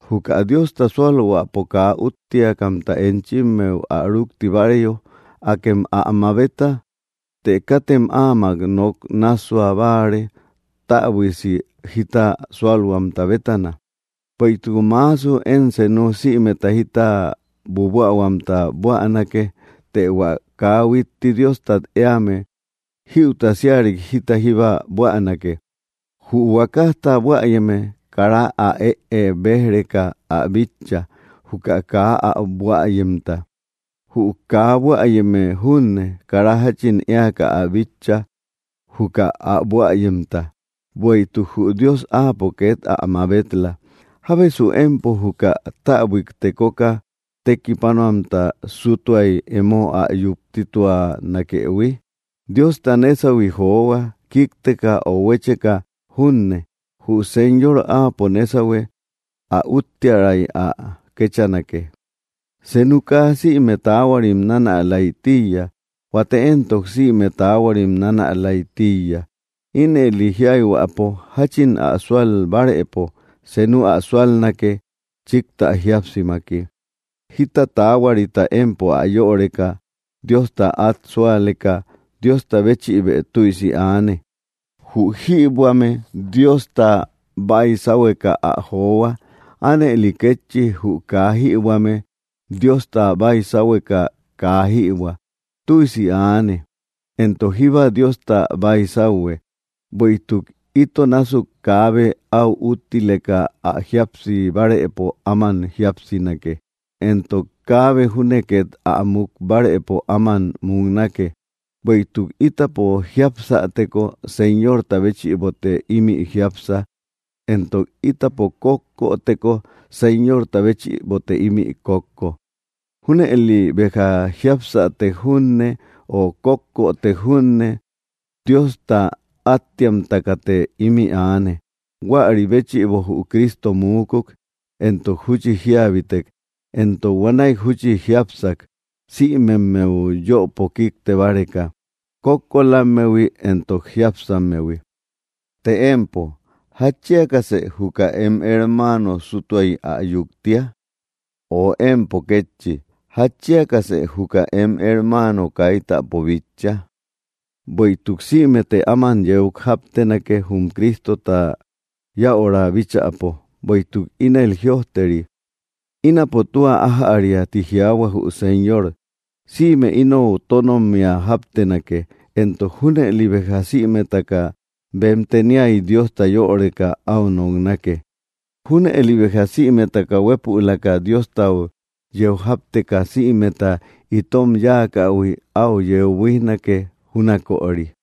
Juka Diosta súalhuäpo kaa úttiakamta enchimmeu ä rúkti báareyo, akem ä mabeta; të katem áamak nok nássua báare täbuiasi jita sualhuamta bétana. Bueïtuk maasu én senu sïmeta jita buabuähuamta buänake; të hua kaa huitti Diostat éame, jïuta síarik jita jíba buänake. Jü huakajta buäyeme, kara ä ée béj‑reka ä bitcha, juka kaa ä buäyemta. Jü kä buäyeme junne, kara jáchin éaka ä bitcha, juka ä buäyemta, bueïtuk jü Dios áapo két ä mabel-la. ¿Jábesu empo, juka täbuik tekoka tekipanuamta sútuay emo ä yuptituanakëhui? Diosta nésahui johua, kíkteka ö huécheka junne. Jü Señor Áapo nésahue; ä úttiäray ä kéchanake. Senu kaa sïme taahuarim nanälay tíiya. Huate éntok sïme taahuarim nanälay tíiya. Ínëli jiayhuäpo, jáchin ä súal bárëpo, senu ä súalnake, chíktä jíapsimaki. Jíta taahuarita empo yöreka Diosta át súaleka, Diosta béchïbë tüisi aane. Jü jïbuäme Diosta baisahueka ä johua. Ánëli kétchi, jü kaa jïbuäme Diosta baisahueka kaa jïbuä. Tüisi aane, entok jíba Diosta baisauhue. Bueïtuk ito násuk kaabe áu úttileka ä jíapsi bárëpo áman jíapsinake, entok kaabe júne két ä muk bárëpo áman muknake. Bueïtuk ítapo jiapsäteko, Señorta béchïbote ímï jiápsa; entok ítapo kókkoteko, Señorta béchïbote ímï kókko. Júnëli béjja, jiapsätek junne, ö kókkotek junne, Diosta áttiamtakate ímï aane. Huäri béchïbo jü Cristo muukuk entok júchi jíabitek, entok huanäi júchi jiápsak, sïmemmeu yöpo kíkte báreka, kókkolammehui entok jiápsammehui. Të empo, ¿jatchiakasë juka em hermaano sútuay ä yuktia? Ö empo kétchi, ¿jatchiakasë juka em hermaano kaitapo bitcha? Bueïtuk sïmete áman yeu jáptenake, jum Cristota yäura bíchäpo. Bueïtuk ínel jïojteri: Ínapo tua ájäria, ti jiaahua jü Señor. Sïme inou tónommia jáptenake, entok junëli béja sïmetaka bem teniay Diosta yöreka áu noknake. Júnëli béja sïmetaka huepülaka Diostau yeu jápteka sïmeta itom yáakähui áu yeu buíjnake, júnaköri.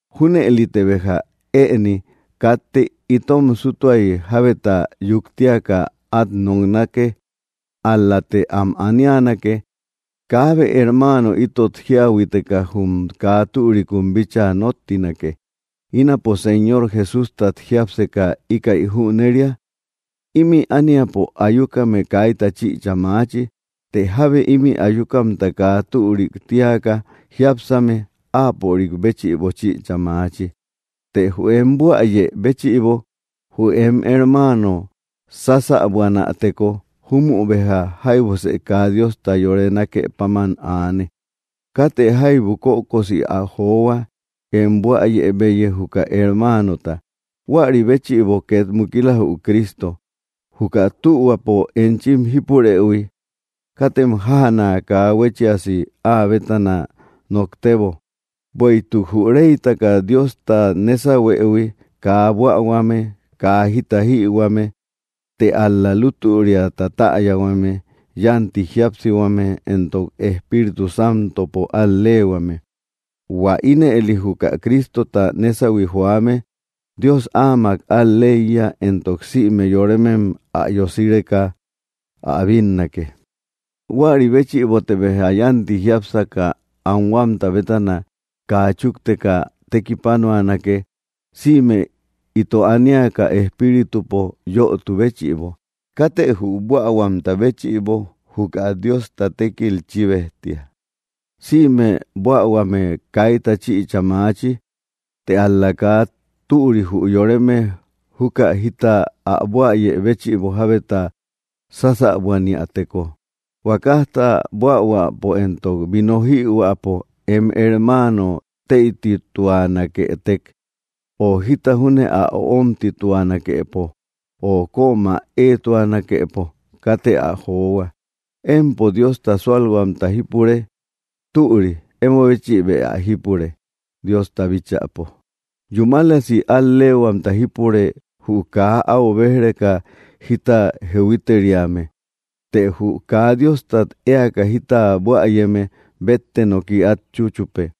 Júnëlite béja ëni katte itom súttuay jábeta yuktiaka át noknake; ál‑late am anianake, kaabe hermaano itot jíahuiteka jum kaa türikun bíchaa nóttinake. Ínapo Señor Jesústat jiápseka íkäi jüneria: Ímï ániapo ayukame kaita chïcha maachi; të jábe ímï ayukamta kaa türi tíaka jiápsame, áapörik béchïbo chïcha maachi. Të jü em buäyë béchïbo jü em hermaano sásäbuanäteko, júmü béja jaibusë kaa Diosta yore nákë páman aane. Katë jaibu kökosi ä johua, em buäyebeyi, juka hermaanota. Huäri béchïbo két mukila, jü Cristo. Juka tühuapo enchim jípurëhui, katem jájana kaa huéchiasi áa bétana noktebo. Bueïtuk jü reytaka Diosta nésahuëhui kaa buähuame, kaa jita jïhuame, të ál‑la lútüriata täyahuame, yánti jíapsihuame entok Espíritu Santopo al‑leehuame. Huä ínëli juka Cristota nésahui joame, Dios áamak al‑leiya, entok sïme yoremem ä yosireka ä bínnake. Huäri béchïbote béja yánti jiápsaka anhuamta bétana kaa chúkteka tekipanuanake, sïme ito aniaka espíritupo yötu béchïbo. Katë jü buähuamta béchïbo juka Diosta tékil chíbejtia. Sïme buähuame kaita chïcha maachi; të ál‑la kaa türi jü yoreme juka jita ä buäyë béchïbo jábeta sásäbuaniäteko. Huakajta buähuäpo entok vino jïhuäpo em hermaano teïtituanaketek, ö jita júne ä öomtituanakepo, ö kömä éetuanakepo, katë ä johua. ¿Empo Diosta súalhuamta jípure? Türï emo béchïbë ä jípure, Diosta bíchäpo. Yúmalasi al‑leehuamta jípure jü kaa áu béj‑reka jita jehuiteriame. Të jü kaa Diostat éaka jita buäyeme bétte noki át chúchupe,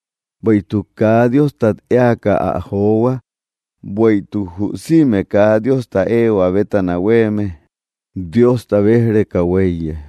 bueïtuk kaa Diostat éaka ä johua; bueïtuk jü sïme kaa Diosta éehua bétana huéeme Diosta béj‑reka huéiye.